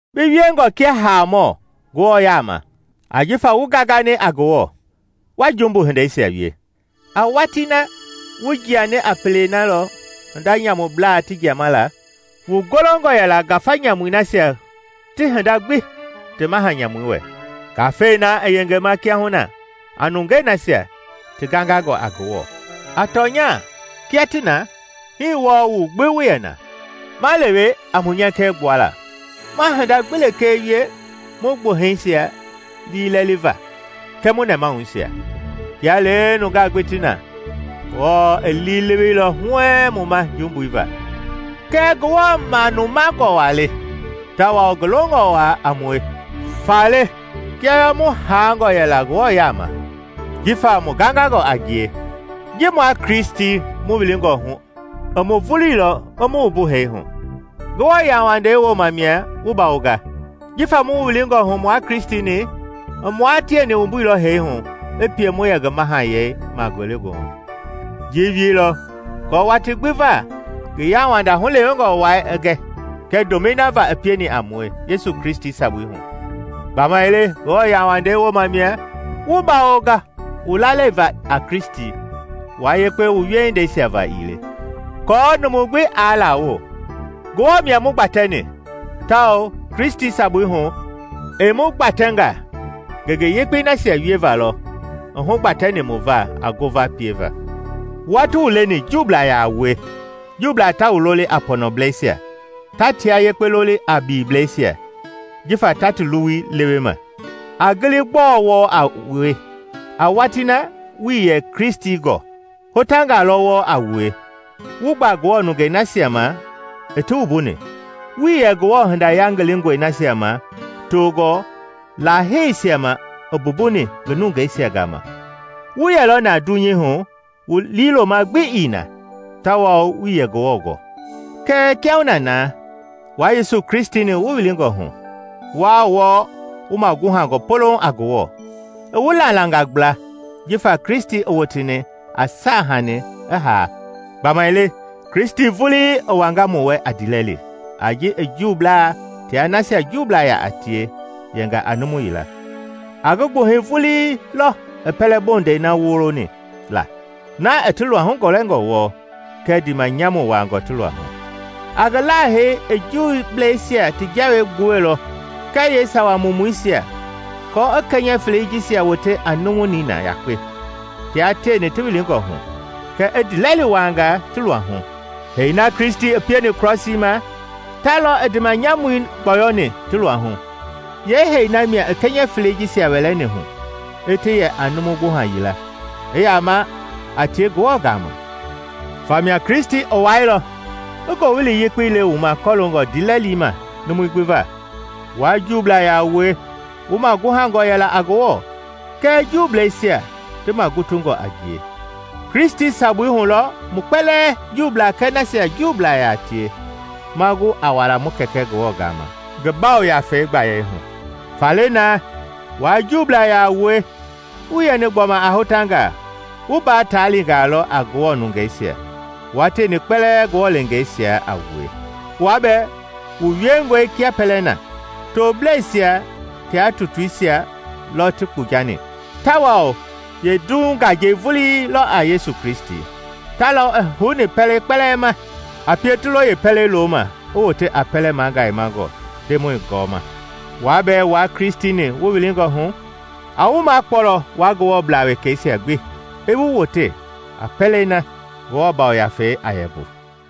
Bi wiengɔ kia haamɔ Ngewɔ yaama, ajifa wu gangani a Ngewɔ, wa jumbu hindeisia wie. A watii na, wu jiani a pele na lɔ hinda nyamublaa ti jiama la; wu golongɔ yɛla ngafa nyamui nasia ti hinda gbi ti maha nyamui wɛ, ngafei na i yengema kiahuna a nungei nasia ti gangangɔ a Ngewɔ. A tɔnya kia ti na, hii wɔɔ mu gbi mu yɛ na, ma lewe a mu nyɛkɛ gbuala, ma hinda gbi lekee wie mu gbuhɛisia liilɛliva kɛɛ mu nɛmahuisia. Kia lee nungaa gbi ti na, Ngewɔ i liileweilɔ huɛɛŋ mu ma jumbui va. Kɛɛ Ngewɔ manumangɔ waa le, tawao ngi longɔ waa a mue, faale kia bɛɛ mu haangɔ Ngewɔ yaama yɛla jifa mu gangangɔ a ngie, ji mua Kristi mu wilingɔ hu i mu vuluilɔ i mu wumbu hee hu. Ngewɔ yauwandei wooma mia wu bawonga. Jifa mu wilingɔ hu mua Kristi-ni, i mua tieni wumbuilɔ hee hu i pie mu yɛ ngi mahayɛi ma ngelegoohu. I ji wieilɔ aako watii gbi va ngi yauwanda hulewengɔ wai i gɛ, kɛɛ ndomɛi na va i pieni a mue Yesu Kristi sabui hu. Gbamaile Ngewɔ yauwandei wooma mia wu bawonga mu lalei va a Kristi, wua yekpe wu wiehindeisia va ii le, aako numu gbi aa lawo. Ngewɔ mia mu gbatɛni, tawao Kristi sabui hu, i mu gbatɛnga ngenge yekpei nasia wieva lɔ i hugbatɛni mu va a ngova pieva. Wua ti wu leni Juublaa yaa wue, Juublaa ta wu loli a “pɔnɔblɛisia” ta tia yekpe loli a biliblɛisia, jifa ta ti luwui lewe ma. A gili gbɔɔ wɔɔ a wue. A watii na wuii yɛ Kristi gɔɔ. Hotangaa lɔ wɔɔ a wue, wu gba Ngewɔ nungei nasia ma i ti wumbuni. Wuii yɛ Ngewɔ hinda yangilingɔi nasia ma toongɔ laaheisia ma i mbumbuni ngi nungeisia gama, wu yɛlɔ na dunyei hu wu liiloma gbi ii na, tawao wuii yɛ Ngewɔ gɔ. Kɛɛ kiahuna na, wua Yesu Kristi-ni wu wilingɔ hu, wua wɔɔ wu maguhangɔ polouŋ a Ngewɔ, i wu lalangaa gbla jifa Kristi i woteni a saahanii i haa. Gbamaile Kristi vulii i wanga mu wɛ a ndiilɛli a ji i Juublaa tia nasia Juublaa yaa tie yɛnga a numu yila. A ngi gbuhɛi vulii lɔ i pɛlɛ-bondɛi na woloni la, na i ti luahu gɔlɛngɔ wɔɔ, kɛ ndiimanyamu wuaangɔ ti luahu. A ngi haalei i Juubleisia ti jawei gbuɛilɔ kɛɛ yeesawa mumuisia aako i kɛnyɛ felei jisia wote a numu nina yakpe tia tieni ti wilingɔ hu, kɛ i ndiilɛli wuaanga ti luahu. Hee na Kristi pieni krɔsii ma, ta lɔ i ndiimanyamui gbɔyɔni ti luahu; yeehee na mia i kɛnyɛ felei jisia wɛlɛni hu, i ti yɛ a numu gbuha yila, i yama a tie Ngewɔ gama. Famia Kristi i wailɔ i Ngowili Yekpei le wu ma kɔloongɔ ndiilɛli ma numui gbi va, wua Juublaa yaa wue wu maguhangɔ yɛla a Ngewɔ, kɛɛ Juubleisia, ti magutungɔ a ngie. Kristi sabui hu lɔ mu kpɛlɛɛ, Juublaa kɛɛ nasia Juublaa yaa tie ma gu a wala mu Kɛkɛ Ngewɔ gama ngi Yafei gbayei hu. Faale naa, wua Juublaa yaa wue wuii yɛni gbɔma a hotangaa; wu mbaa taalingaa lɔ a Ngewɔ nungeisia, wua tieni kpɛlɛɛ Ngewɔ leengeisia a wue. Wua bɛɛ wu wiengɔe kia pɛlɛ na. Tobleisia tia tutuisia lɔ ti kpujani, tawao yeendiihu ngajei vuilɔ a Yesu Kristi! Ta lɔ i houni pɛlei kpɛlɛɛ ma, a pie ti lo yeepɛlei loma i wote a pɛlɛ magayemangɔ Ndemɔi gɔɔma. Wua bɛɛ wua Kristi-ni wu wilingɔ hu, a wu makpɔlɔ wua Ngewɔblaa wekɛisia gbi i wu wote a pɛlei na Ngewɔ Yafei a yɛ mbu.